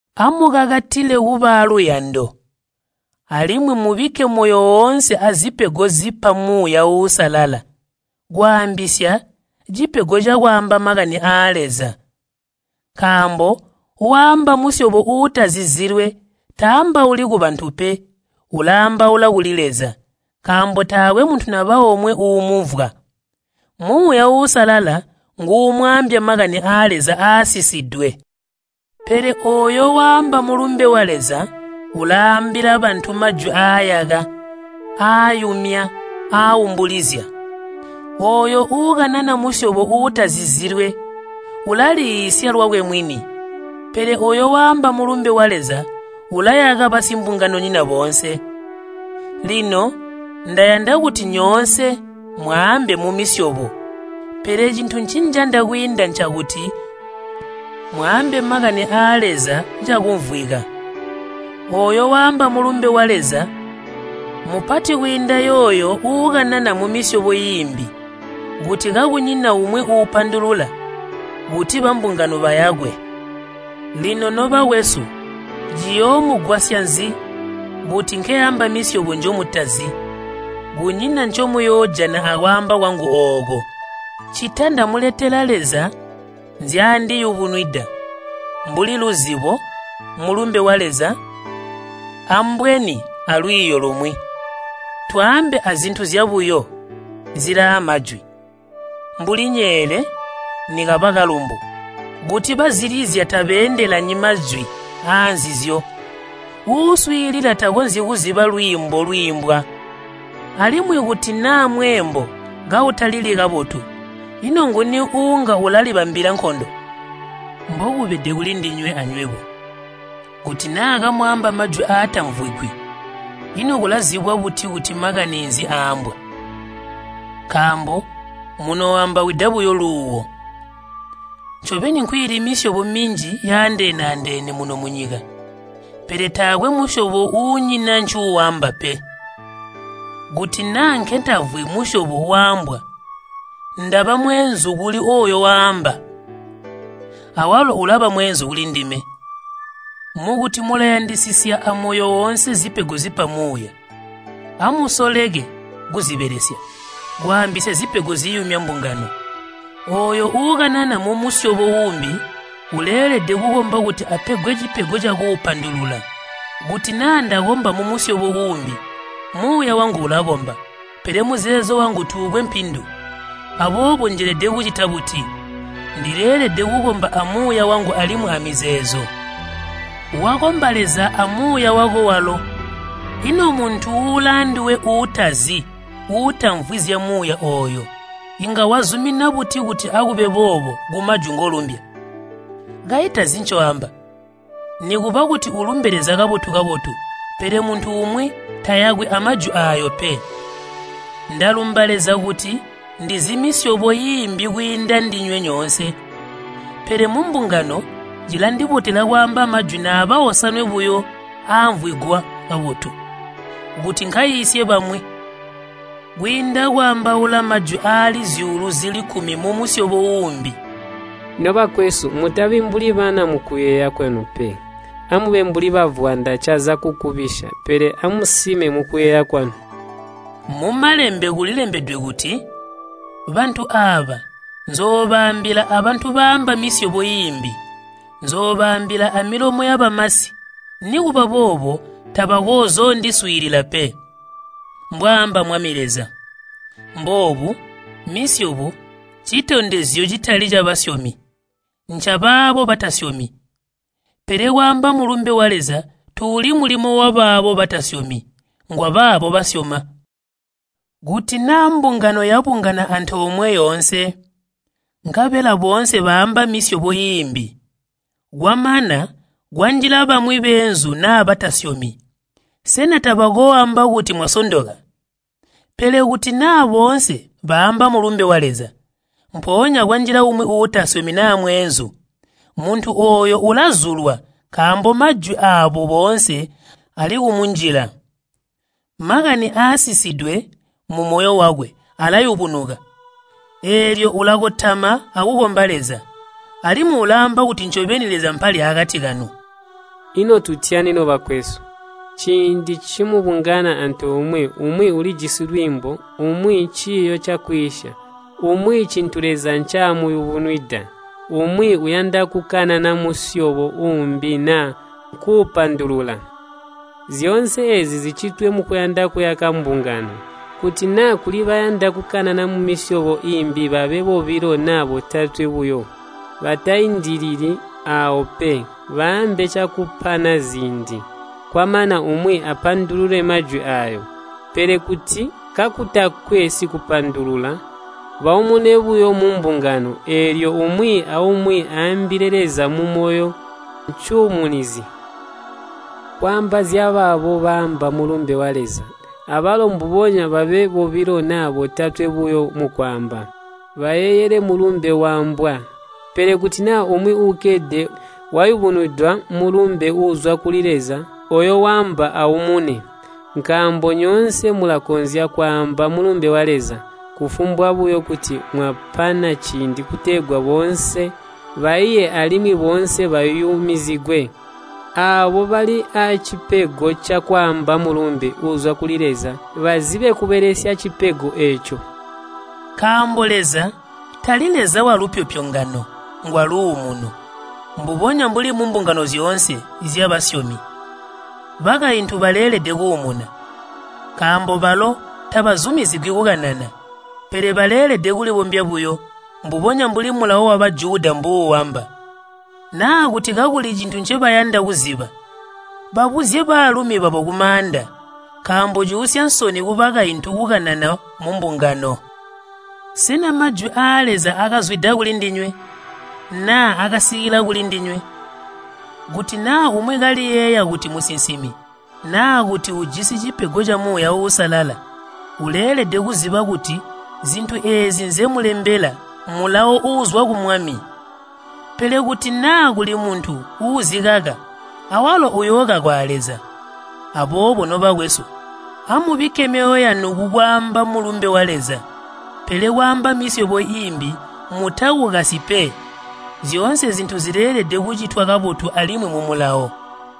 Amukakatile kuba aaluyando, alimwi mubikke moyo oonse azipego zipa Muuya Uusalala, kwaambisya cipego cakwaamba makani aa Leza. Nkaambo waamba musyobo uutazizilwe taambauli kubantu pe, ulaambaula kuli Leza, nkaambo taakwe muntu naba omwe uumumvwa. Muuya Uusalala nguumwaambya makani aa Leza aasisidwe. Pele ooyo waamba mulumbe wa Leza ulaambila bantu majwi aayaka, aayumya, aaumbulizya. Ooyo uukanana musyobo uutazizilwe ulaliiisya lwakwe mwini, pele ooyo waamba mulumbe wa Leza ulayaka basimbunganonyina boonse. Lino ndayanda kuti nyoonse mwaambe mumisyobo, pele cintu ncinjanda kwiinda ncakuti mwaambe makani aa Leza cakumvwika. Ooyo waamba mulumbe wa Leza mmupati kwiinda yooyo uukanana mumisyobo iimbi, kuti kakunyina umwi uupandulula kuti bambungano bayakwe. Lino nobakwesu, ciyoomugwasya nzi kuti nkeamba misyobo njomutazi? Kunyina ncomuyoojana akwaamba kwangu ooko, ccita ndamuletela Leza nzyaandiyubunwida, mbuli luzibo, mulumbe wa Leza, ambweni alwiiyo lumwi. Twaambe azintu zyabuyo zilaamwajwi, mbuli nyeele nikaba kalumbu. Kuti bazilizya tabeendelanyi majwi aanzizyo, uuswiilila takonzyi kuziba lwiimbo lwiimbwa. Alimwi kuti naa mweembo kautalili kabotu, ino nguni uunga ulalibambila nkondo? Mbokubede kulindinywe anywebo, kuti naa kamwaamba majwi aatamvwigwi, ino kulazibwa buti kuti makani nzi aaambwa? Nkaambo munooambawida buyo luuwo. Ncobeni nkwiili misyobo minji yaandeene-andeene muno munyika, pele taakwe musyobo uunyina ncuuamba pe. Kuti naa nketamvwi musyobo waambwa, ndaba mweenzu kuli ooyo waamba, awalo ulaba mweenzu kulindime. Mukuti mulayandisisya amoyo woonse zipego zipa Muuya, amusoleke kuzibelesya, kwaambisya zipego ziyumya mbungano. Ooyo uukanana mumusyobo uumbi uleelede kukomba kuti apegwe cipego cakuupandulula. Kuti naa ndakomba mumusyobo uumbi, muuya wangu ulakomba, pele muzeezo wangu tuukwe mpindu. Aboobo njelede kucita buti? Ndileelede kukomba amuuya wangu alimwi amizeezo. Wakomba Leza amuuya wako walo, ino muntu ulaanduwe uutazi, uutamvwi zyamuuya ooyo, inga wazumina buti kuti, “Akube boobo” kumajwi ngolumbya? Kayi tazi ncoamba! Nikuba kuti ulumbe Leza kabotu-kabotu, pele muntu umwi tayakwi amajwi aayo pe. Ndalumba Leza kuti ndizi misyobo iimbi kwiinda ndinywe nyoonse, pele mumbungano cilandibotela kwaamba majwi naaba osanwe buyo aamvwigwa kabotu, kuti nkaiisye bamwi, kwiinda kwaambaula majwi aali zyuulu zili kkumi mumusyobo uumbi. Nobakwesu, mutabi mbuli bana mukuyeeya kwanu pe. Amube mbuli bavwanda caza kukubisya, pele amusime mukuyeeya kwanu. Mumalembe kulilembedwe kuti, “Bantu aaba nzoobaambila abantu baamba misyobo iimbi, nzoobaambila amilomo yabamasi, nikuba boobo tabakoozoondiswiilila pe,” mbwaamba Mwami Leza. Mboobu, misyobo ncitondezyo citali cabasyomi, ncabaabo batasyomi, pele kwaamba Mulumbe wa Leza tuuli mulimo wabaabo batasyomi, ngwabaabo basyoma. Kuti naa mbungano yabungana antoomwe yoonse, nkabela boonse baamba misyobo iimbi, kwamana kwanjila bamwi beenzu naa batasyomi, sena tabakooamba kuti mwasondoka? Pele kuti naa boonse baamba Mulumbe wa Leza, mpoonya kwanjila umwi uutasyomi naa mweenzu, muntu ooyo ulazulwa nkaambo majwi aabo boonse alikumunjila. Makani aasisidwe mumoyo wakwe alayubunuka, eelyo ulakotama akukomba Leza, alimwi ulaamba kuti ncobeni Leza mpali akati kanu. Ino tutyani, nobakwesu? Ciindi ncimubungana antoomwe, umwi ulijisi lwiimbo, umwi ciiyo cakwiisya, umwi cintu Leza ncaamuyubunwida, umwi uyanda kukanana musyobo uumbi naa kuupandulula. Zyoonse eezi zicitwe mukuyanda kuyaka mbungano. Kuti naa kuli bayanda kukanana mumisyobo iimbi babe bobilo naa botatwe buyo, bataindilili aawo pe. Baambe cakupana ziindi. Kwamana umwi apandulule majwi aayo. Pele kuti kakutakwe sikupandulula baumune buyo mumbungano, eelyo umwi aumwi aambile Leza mumoyo cuumunizi. Kwaamba zyabaabo baamba Mulumbe wa Leza, abalo mbubonya babe bobilo naa botatwe buyo mukwaamba, bayeeyele mulumbe waambwa. Pele kuti naa umwi uukkede wayubunwidwa mulumbe uuzwa kuli Leza, ooyo waamba aumune. Nkaambo nyoonse mulakonzya kwaamba mulumbe wa Leza, kufumbwa buyo kuti mwapana ciindi kutegwa boonse baiye alimwi boonse bayumizigwe. Aabo bali aacipego cakwaamba mulumbe uuzwa kuli Leza bazibe kubelesya cipego eeco. Nkaambo Leza tali Leza walupyopyongano, ngwaluumuno. Mbubonya mbuli mumbungano zyoonse zyabasyomi, bakaintu baleelede kuumuna. Nkaambo balo tabazumizigwi kukanana, pele baleelede kulibombya buyo, mbubonya mbuli Mulawo wa Bajuda mbuuamba. Naa kuti kakuli cintu ncebayanda kuziba, babuzye baalumi babo kumaanda. Nkaambo cuusya nsoni kubakaintu kukanana mumbungano. Sena majwi aa Leza akazwida kulindinywe, naa akasikila kulindinywe? Kuti naa umwi kaliyeeya kuti musinsimi, naa kuti ujisi cipego ca Muuya Uusalala, uleelede kuziba kuti zintu eezi nzemulembela mulawo uuzwa ku Mwami. Pele kuti naa kuli muntu uuzikaka, awalo uyookakwa a Leza. Aboobo nobakwesu, amubikke myoyo yanu kukwaamba mulumbe wa Leza, pele kwaamba misyobo iimbi mutakukasyi pe. Zyoonse zintu zileelede kucitwa kabotu alimwi mumulawo.